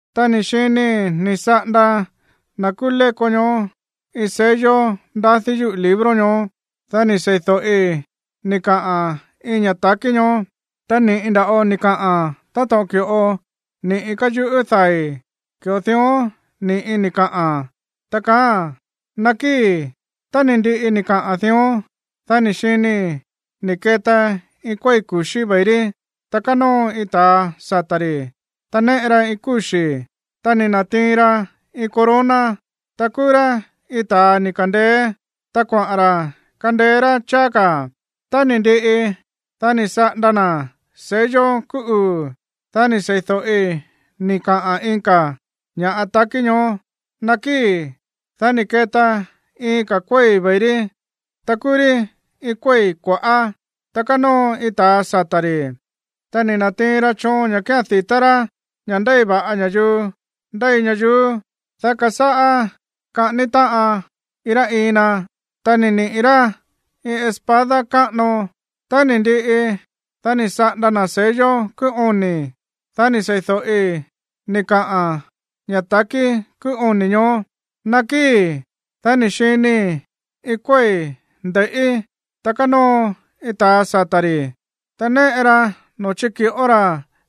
Ta ni̱ xinii̱ ni̱ saꞌanda na̱ kúú léko ñoó iin sello ndadí yúꞌu̱ libro ñoó. Dá ni̱ sei̱do̱ꞌi ni̱ kaꞌa̱n iin ña̱ ta̱kí ñoó, ta ni̱ꞌi nda̱ꞌo ni̱ kaꞌa̱n. Táto̱ꞌon ki̱ꞌo ni̱ꞌi káyuꞌú dai̱, ki̱ꞌo dión ni̱ꞌi ni̱ kaꞌa̱n, ta kaáa̱n: ―Nakíi̱. Tá ni̱ ndiꞌi ni̱ kaꞌa̱n dión, dá ni̱ xinii̱ ni̱ keta iin kuéi̱ ku̱xí ve̱i rí, ta kánóo iin ta̱a sata̱ ri̱, ta néꞌe ra iin kúxi̱. Ta ni̱ na̱tiin ra iin corona, ta kúú rá iin ta̱a ni̱ ka̱ndeé, ta kuaꞌa̱n ra̱ kandeé rá cháá ka̱. Tá ni̱ ndiꞌi, dá ni̱ saꞌanda na̱ sello kúú uu̱, dá ni̱ sei̱do̱ꞌi ni̱ kaꞌa̱n iin ka̱ ña̱ ta̱kí ñoó: ―Nakíi̱. Dá ni̱ keta iin ka̱ kuéi̱ ve̱i rí, ta kúú rí iin kuéi̱ kua̱ꞌá. Ta kánóo iin ta̱a sata̱ ri̱, ta ni̱ na̱tiin ra choon ña̱ kía̱n di̱tá rá ña̱ ndéi va̱ꞌa ña̱yuu ndéi ñayuú, dá kasáꞌá kaꞌání táꞌan iin rá iin na. Ta ni̱ niꞌi̱ rá iin espada káꞌano. Tá ni̱ ndiꞌi, dá ni̱ saꞌanda na̱ sello kúú oni̱, dá ni̱ sei̱do̱ꞌi ni̱ kaꞌa̱n ña̱ ta̱kí kúú oni̱ ñoó: ―Nakíi̱. Dá ni̱ xinii̱ íin iin kuéi̱ nde̱i̱ꞌí, ta kánóo iin ta̱a sata̱ ri̱, ta néꞌe ra noo̱ chíki̱ꞌó ra̱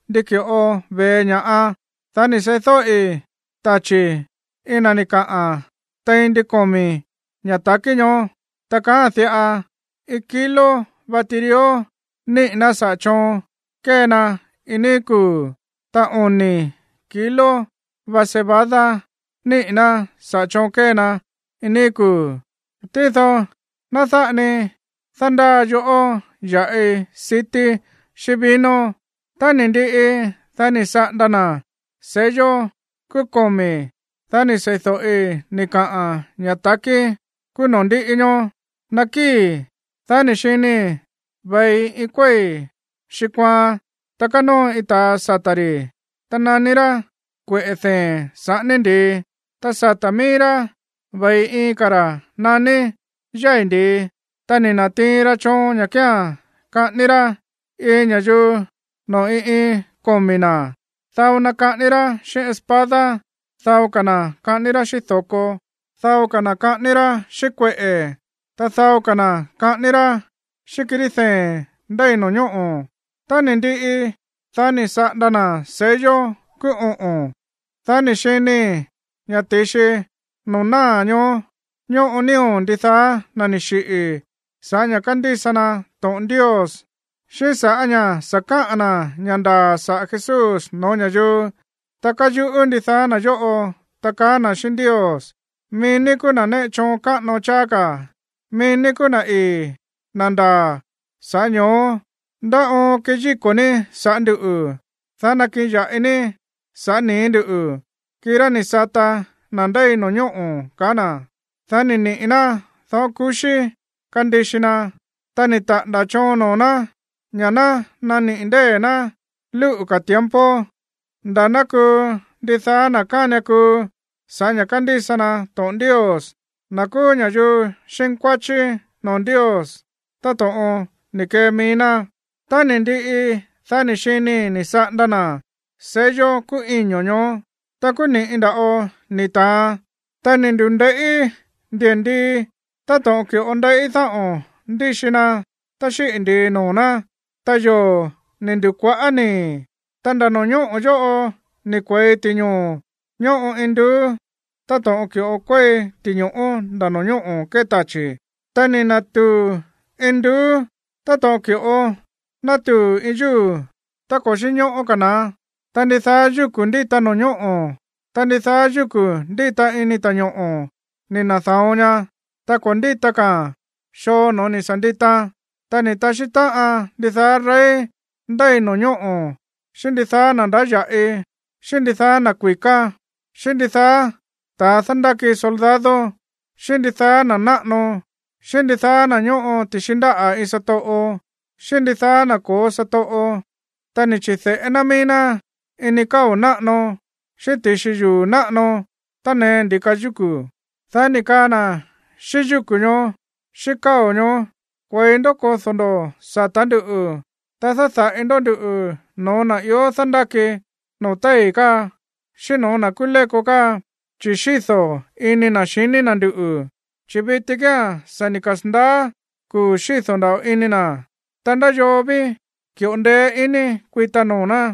ndi ki̱ꞌo ve̱e ña̱ꞌa. Dá ni̱ seídóꞌi tachi̱ iin na̱ ni̱ kaꞌa̱n tein ndin komi̱ ña̱ ta̱kí ñoó, ta kaáa̱n diꞌa: ―Iin kilo va tirió niꞌi̱ ná saꞌa̱ choon kée na iin níí kuu̱, ta oni̱ kilo va cebada niꞌi̱ ná saꞌa̱ choon kée na iin níí kuu̱. Tído ná dáꞌa ni dándáa yoꞌó ya̱ꞌi sití xíꞌín vino. Tá ni̱ ndiꞌi, dá ni̱ saꞌanda na̱ sello kúú komi̱, dá ni̱ sei̱do̱ꞌi ni̱ kaꞌa̱n ña̱ ta̱kí kúú noo̱ ndíꞌi ñoó: ―Nakíi̱. Dá ni̱ xinii̱ ve̱i iin kuéi̱ xiꞌi̱ kuaan, ta kánóo iin ta̱a sata̱ ri̱, ta naní rá Kueꞌe̱ Dee̱n Saꞌání Ndi̱i. Ta sata̱ mií rá ve̱i iin ka̱ ra̱ naní Yái̱ Ndi̱i. Ta ni̱ na̱tiin ra choon ña̱ kía̱n kaꞌání rá iin ña̱yuu noo̱ iin iin komi̱ ná. Dao na kaꞌání rá xíꞌín espada, dao ka̱ na̱ kaꞌání rá xíꞌín do̱ko, dao ka̱ na̱ kaꞌání rá xíꞌín kueꞌe̱, ta dao ka̱ na̱ kaꞌání rá xíꞌín kirí dee̱n ndéi no̱ñóꞌo̱. Tá ni̱ ndiꞌi, dá ni̱ saꞌanda na̱ sello kúú oꞌo̱n, dá ni̱ xinii̱ ña̱ ti̱xi noo̱ náa̱ ñoó ñóꞌo nío̱ ndidaá na̱ ni̱ xiꞌi̱ sa̱ꞌá ña̱ kándísa na to̱ꞌon Ndios xíꞌín sa̱ꞌá ña̱ sa̱ káꞌa̱n na̱ ña̱ ndaa̱ saꞌa̱ Jesús no̱ó ña̱yuu. Ta káyuꞌú ndidaá na̱ yóꞌo, ta kaá na̱ xíꞌín Ndios: ―Mií ní kúú na̱ néꞌe choon káꞌano cháá ka̱, mií ní kuu na̱ ii̱, na̱ ndaa̱, sa̱ꞌá ño̱ó, ¿ndá oon keyíko̱ ní saꞌa̱ ndúꞌu̱, dá nakiꞌin ya̱ꞌi ní sa̱ꞌá nii̱ ndúꞌu̱, kirá ni̱ sata na̱ ndéi no̱ñóꞌo̱? ―kaá na̱. Dá ni̱ niꞌi̱ ná dáꞌo̱n ku̱xí kandixi na, ta ni̱ taꞌa̱nda̱ choon noo̱ ná ña̱ ná naniꞌi̱ ndée̱ ná lúꞌu̱ ka̱ tiempo nda̱ ná kuu ndidaá na̱ kánian kuu sa̱ꞌá ña̱ kándísa na to̱ꞌon Ndios, na̱ kúú ña̱yuu xínkuáchí noo̱ Ndios táto̱ꞌon ni̱ kee mií ná. Tá ni̱ ndiꞌi, dá ni̱ xinii̱ ni̱ saꞌanda na̱ sello kúú iño̱ ñoó. Ta kúú ni̱ꞌi nda̱ꞌo ni̱ ta̱an, ta ni̱ ndu̱nde̱i̱ꞌí ndi̱ndii táto̱ꞌon ki̱ꞌo ndeiꞌí dáꞌo̱n ndíxi na tá xíꞌi̱ ndi̱i noo̱ ná, ta yoo̱ ni̱ ndu̱kua̱ꞌá nii̱. Ta nda̱ no̱ñóꞌo̱ yóꞌo ni̱ kue̱i ti̱ñoo̱ ñóꞌo induú, táto̱ꞌon ki̱ꞌo kuéi ti̱ño̱ꞌó nda̱ no̱ñóꞌo̱ kée tachi̱. Ta ni̱ na̱tuu̱ induú táto̱ꞌon ki̱ꞌo nátuu̱ iin yúu̱ tá ko̱ xínñóꞌó ka̱ na̱án. Ta ndidaá yúku̱ ndíta no̱ñóꞌo̱, ta ndidaá yúku̱ ndíta ini ta̱ñoꞌo̱ ni̱ na̱da̱on ña, ta ko̱ ndíta ka̱a̱n xoo no̱ó ni̱ sa̱ nditaan. Ta ni̱ taxí táꞌan ndidaá rey ndéi no̱ñóꞌo̱, xíꞌín ndidaá na̱ ndáya̱ꞌi, xíꞌín ndidaá na̱ kui̱ká, xíꞌín ndidaá ta̱ dándáki soldado, xíꞌín ndidaá na̱ náꞌano, xíꞌín ndidaá na̱ ñóꞌo ti̱xi ndáꞌa̱ iin satoꞌo, xíꞌín ndidaá na̱ ko̱ó satoꞌo, ta ni̱ chi̱de̱ꞌé ná mií ná ini káo̱ náꞌano, xíꞌín ti̱xi yuu̱ náꞌano tánee ndi̱ka yúku̱, dá ni̱ kaa na̱ xíꞌín yúku̱ ñoó, xíꞌín káo̱ ñoó: ―Kue̱i ndó kodó ndó sata̱ ndúꞌu̱, ta dáda̱ꞌi ndó nduꞌu̱ no̱ó na̱ ió dándáki noo̱ téi̱ káa, xíꞌín no̱ó na̱ kúú léko káa, chi̱ xído̱ ini na̱ xiní na̱ nduꞌu̱, chi̱ viti kía̱n sa̱ ni̱ kasa̱ndaá kuu̱ xído̱ nda̱ꞌo ini na̱, ¿ta ndá yoo ví ki̱ꞌo ndeé iní kuita noo̱ ná?